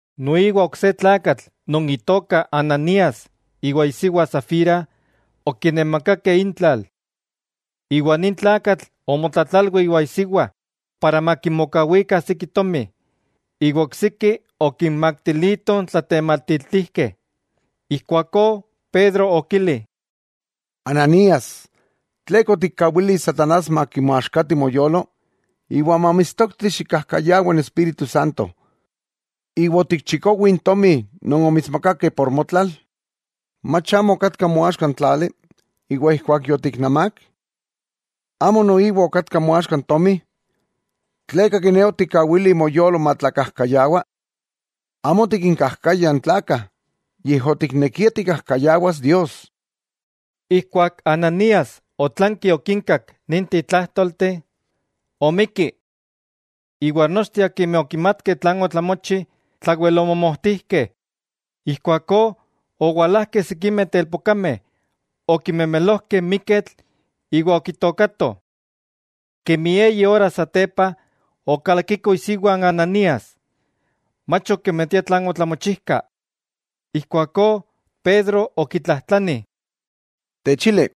Noiwa ok se tlakatl non itoka Ananías iwa isiwa Safira okinemakakeh intlal. Iwa nin tlakatl omotlatlalwi iwa isiwa para makimokawikah siki tomi, iwa oksiki okinmaktilitoh n tlatematiltijkeh. Ijkuakó Pedro okili: —Ananías, ¿tleka otikkawili n satanás makimoaxkati moyolo, iwa mamitstokti xikkajkayawa n Espíritu Santo, iwa otikchikowi n tomi non omitsmakakeh por motlal? ¿Mach amo okatka moaxka n tlali? Iwa ijkuak yotiknemák, ¿amo noiwa okatka moaxka n tomi? ¿Tleka kiné otikkawili moyolo matlakajkayawa? Amo otikinkajkaya n tlakah, yej otiknekia tikkajkayawas Dios. Ijkuak Ananías otlanki okinkak ninteh tlájtolteh, omikki. Iwa nochteh akimeh okimatkeh tlan otlamochi, tlawel omomojtijkeh. Ijkuakó owalajkeh sikimeh telpokameh, okimemelojkeh n miketl iwa okitookatoh. Kemi eyi ora satepa, okalakiko isiwa n Ananías, mach okimatia tlan otlamochijka. Ijkuakó Pedro okitlajtlani: —Techili,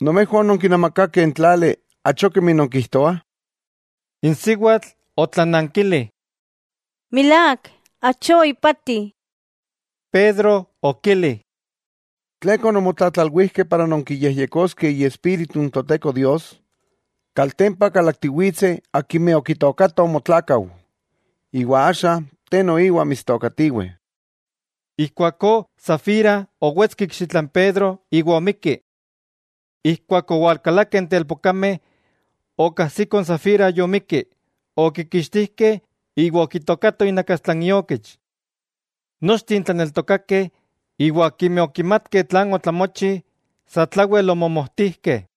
¿Nomejwah ononkinamakakeh n tlali, achó kemi nonkijtoah? N siwatl otlanankili: —Milák, achó ipati. Pedro okili: —¿Tleka ononmotlatlalwijkeh para nonkiyejyekoskeh Iespíritu n Toteko Dios? Kaltempa kalaktiwitseh akimeh okitookatoh motlakau, iwa axa te noiwa mitstookatiweh. Ijkuakó Safira owetski ikxitla n Pedro iwa omikki. Ijkuak owalkalakeh n telpokameh, okajsikoh n Safira yomikki, okikixtijkeh iwa okitookatoh inakastla iokich. Nochteh n tlaneltokakeh, iwa akimeh okimatkeh tlan otlamochi, satlawel omomojtijkeh.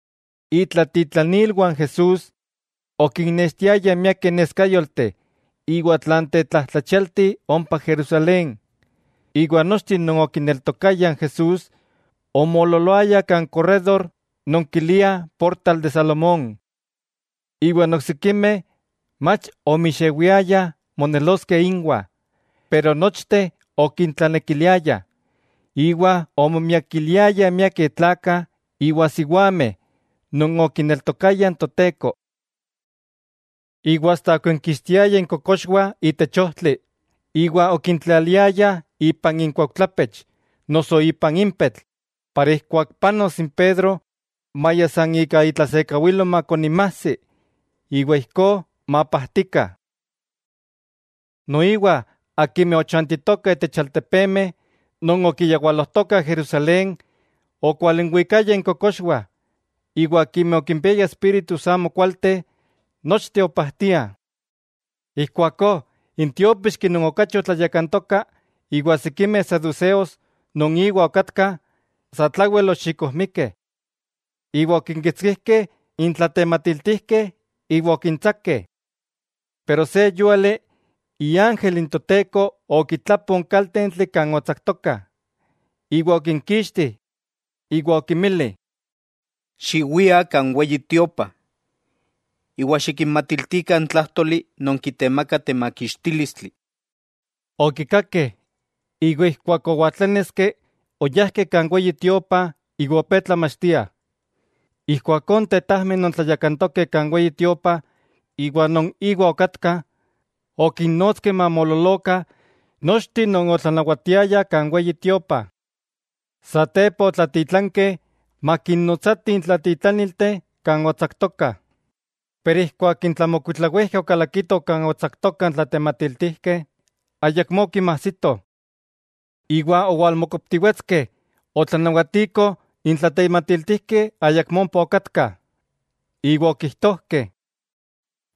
Itlatitlanilwah Jesús okinnextiayah miakeh neskayolteh iwa tlan tetlajtlachialti ompa Jerusalén, iwa nochteh non okineltokayah n Jesús omoololoayah kan korrédor non kiliah Portal de Salomón. Iwa n oksikimeh mach omixewiayah moneloskeh inwah, pero nochteh okintlanekiliayah. Iwa omomiakiliayah miakeh tlakah iwa siwameh non okineltokayah n Toteko. Iwa asta okinkixtiayah inkokoxwah itech ojtli, iwa okintlaliayah ipan inkuaujtlapech noso ipan impetl para ijkuak panos n Pedro, maya san ika itlasekawilo makoninmajsi iwa ijkó mapajtikah. Noiwa akimeh ochantitokah itech altepemeh non okiyawalojtokah Jerusalén, okwalinwikayah inkokoxwah iwa akimeh okimpiayah espíritus amokualteh, nochteh opajtiah. Ijkuakó n tiópixki non okachi otlayakantoka iwa sikimeh saduseos non iwa okatkah, satlawel oxikojmikeh, iwa okinkitskijkeh n tlatematiltijkeh iwa okintsakeh. Pero se yúali iángel n Toteko okitlapo n kaltentli kan otsaktokah, iwa okinkixtih. Iwa okinmili: —Xiwiah kan Weyi Tiopa, iwa xikinmatiltikah n tlájtoli non kitemaka temakixtílistli. Okikakeh, iwa ijkuak owaltláneski oyajkeh kan Weyi Tiopa iwa opé tlamachtiah. Ijkuakó n tetajmeh non tlayakantokeh kan Weyi Tiopa iwa non íwa okatkah, okinnotskeh mamoololokah nochteh non otlanawatiayah kan Weyi Tiopa. Satepa otlatitlankeh makinnotsatih n tlatitlanilteh kan otsaktokah. Pero ijkuak n tlamokuitlawijkeh okalakitoh kan otsaktokah n tlatematiltijkeh, ayakmó okinmajsitoh. Iwa owalmokoptiwetskeh otlanawatikoh n tlatematiltijkeh ayakmó ompa okatkah, iwa okijtojkeh: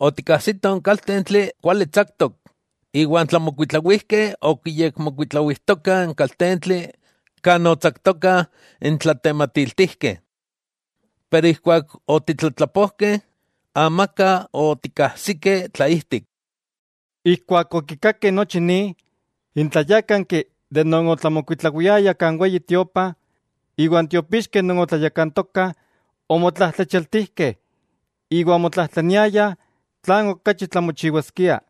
—Otikkajsitoh n kaltentli kuali tsaktok, iwa n tlamokuitlawijkeh okiyekmokuitlawijtokah n kaltentli kan otsaktokah n tlatematiltijkeh, pero ijkuak otitlatlapojkeh, amaka otikajsikeh tlaijtik. Ijkuak okikakeh nochi ni, n tlayákanki de non otlamokuitlawiayah kan Weyi Tiopa iwan tiopixkeh non otlayakantokah, omotlajtlachialtijkeh iwa omotlajtlaniayah tlan okachi tlamochiwaskia.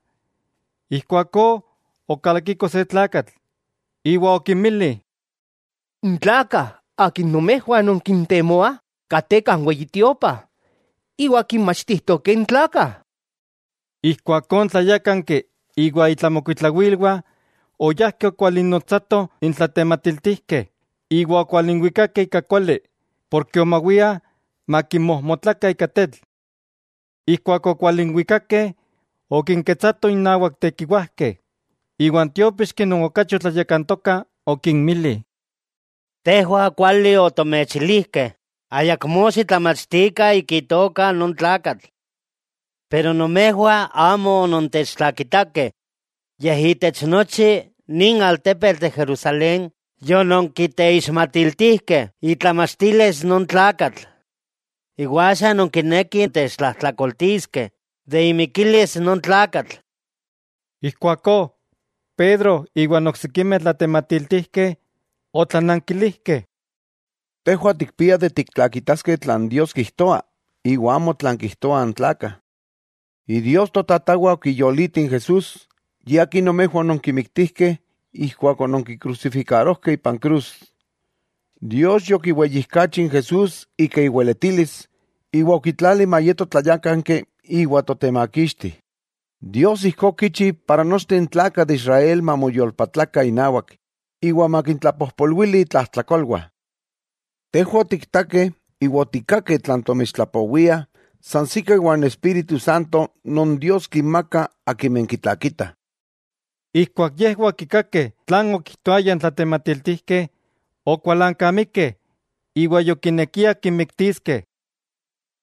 Ijkuakó okalakiko se tlakatl, iwa okinmili: —N tlakah akimeh nomejwah nonkintemoah kateh kan Weyi Tiopa, iwa kinmachtijtokeh n tlakah. Ijkuakó n tlayákanki iwa itlamokuitlawilwah, oyajkeh okwalinnotsatoh n tlatematiltijkeh, iwa okwalinwikakeh ika kuali, porke omawiah makinmojmotlakah ika tetl. Ijkuak okwalinwikakeh, okinketsatoh innawak tekiwajkeh, iwa n tiópixki non okachi otlayakantoka okinmili: —Tejwah kuali otomechilijkeh ayakmó xitlamachtikah ika itoka non tlakatl. Pero nomejwah amo onontechtlakitakeh, yej itech nochi nin altepetl de Jerusalén yononkiteixmatiltijkeh itlamachtilis non tlakatl. Iwa axa nonkinekih techtlajtlakoltiskeh de imikilis non tlakatl. Ijkuakó Pedro iwa n oksikimeh tlatematiltijkeh otlanankilijkeh: —Tejwah tikpiah tiktlakitaskeh tlan Dios kijtoa iwa amo tlan kijtoah n tlakah. Idios totatawah okiyoliti n Jesús, Ye Akin nomejwah ononkimiktijkeh ijkuak ononkikrusifikarojkeh ipan krus. Dios yokiweyijkachi n Jesús ika iweletilis, iwa okitlali mayeto Tlayákanki iwa Totemakixti. Dios ijkó okichi para nochteh n tlakah de Israel mamoyolpatlakah inawak iwa makintlapojpolwili intlajtlakolwah. Tejwah otiktakeh iwa otikkakeh tlan tomechtlapowiah sansikah iwa n Espíritu Santo non Dios kinmaka akimeh kitlakitah. Ijkuak yejwah okikakeh tlan okijtoayah n tlatematiltijkeh, okualankamikeh iwa yokinekiah kinmiktiskeh.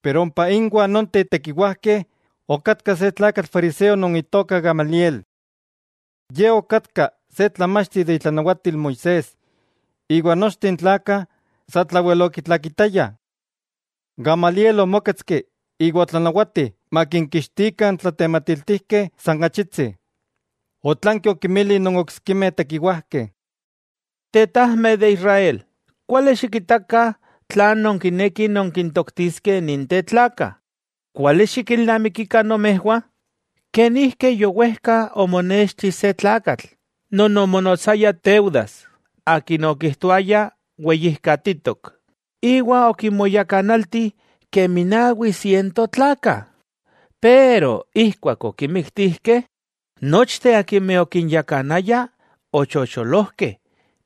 Pero ompa inwah nonteh tekiwajkeh okatka se tlakatl fariseo non itoka Gamaliel. Ye okatka se tlamachti de itlanawatil Moisés iwa nochteh n tlakah satlawel okitlakitayah. Gamaliel omóketski iwa otlanawati makinkixtikah n tlatematiltijkeh san achitsi. Otlanki okinmili non oksikimeh tekiwajkeh: —Tetajmeh de Israel, kuali xikitakah tlan nonkinekih nonkintoktiskeh ninteh tlakah. Kuali xikilnamikikah nomejwah, kenijki yowejka omonexti se tlakatl non omonotsaya Teudas akin okijtoaya weyijkatitok, iwa okinmoyakanalti kemi nawi siento tlakah. Pero ijkuak okimiktijkeh, nochteh akimeh okinyakanaya ochocholojkeh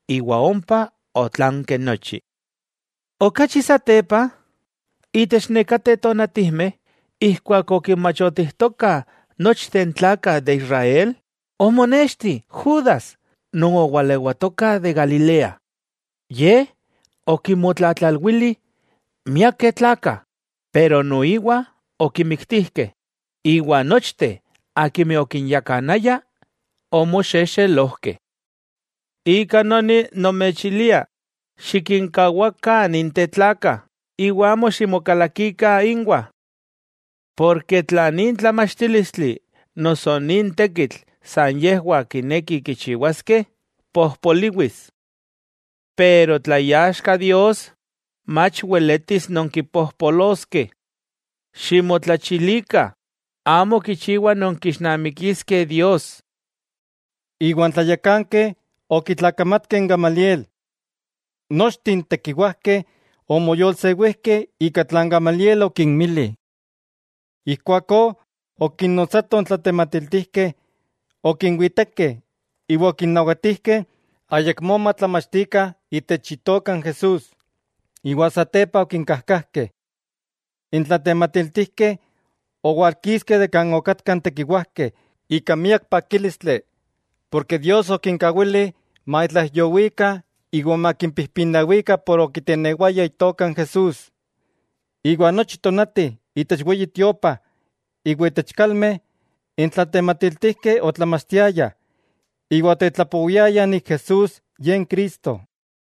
iwa ompa otlanki nochi. Okachi satepa, itech nekateh tonatijmeh ijkuak okinmachotijtokah nochteh n tlakah de Israel, omonexti Judas non owalewatoka de Galilea. Ye okinmotlatlalwili miakeh tlakah, pero noiwa okimiktijkeh; iwa nochteh akimeh okinyakanaya omoxexelojkeh. Ika noni nomechilia, xikinkawakah ninteh tlakah, iwa amo ximokalakikah inwah. Porke tla nin tlamachtílistli noso nin tekitl san yejwah kinekih kichiwaskeh, pojpoliwis. Pero tla iaxka Dios, mach weletis nonkipojpoloskeh. Ximotlachilikah, amo kichiwa nonkixnamikiskeh Dios. Iwa n tlayakankeh okitlakamatkeh n Gamaliel. Nochteh n tekiwajkeh omoyolsewijkeh ika tlan Gamaliel okinmili. Ijkuakó okinnotsatoh n tlatematiltijkeh, okinwitekeh iwa okinnawatijkeh ayakmó matlamachtikah itech Itoka n Jesús, iwa satepa okinkajkajkeh. N tlatematiltijkeh owalkiskeh de kan okatkah n tekiwajkeh ika miak pakílistli, porke Dios okinkawili matlaijyowikah iwa makimpijpinawikah por okitenewayah Itoka n Jesús. Iwa nochi tonati itech Weyi Tiopa iwa itech kalmeh, n tlatematiltijkeh otlamachtiayah iwa otetlapowiayah Jesús, Ye n Cristo.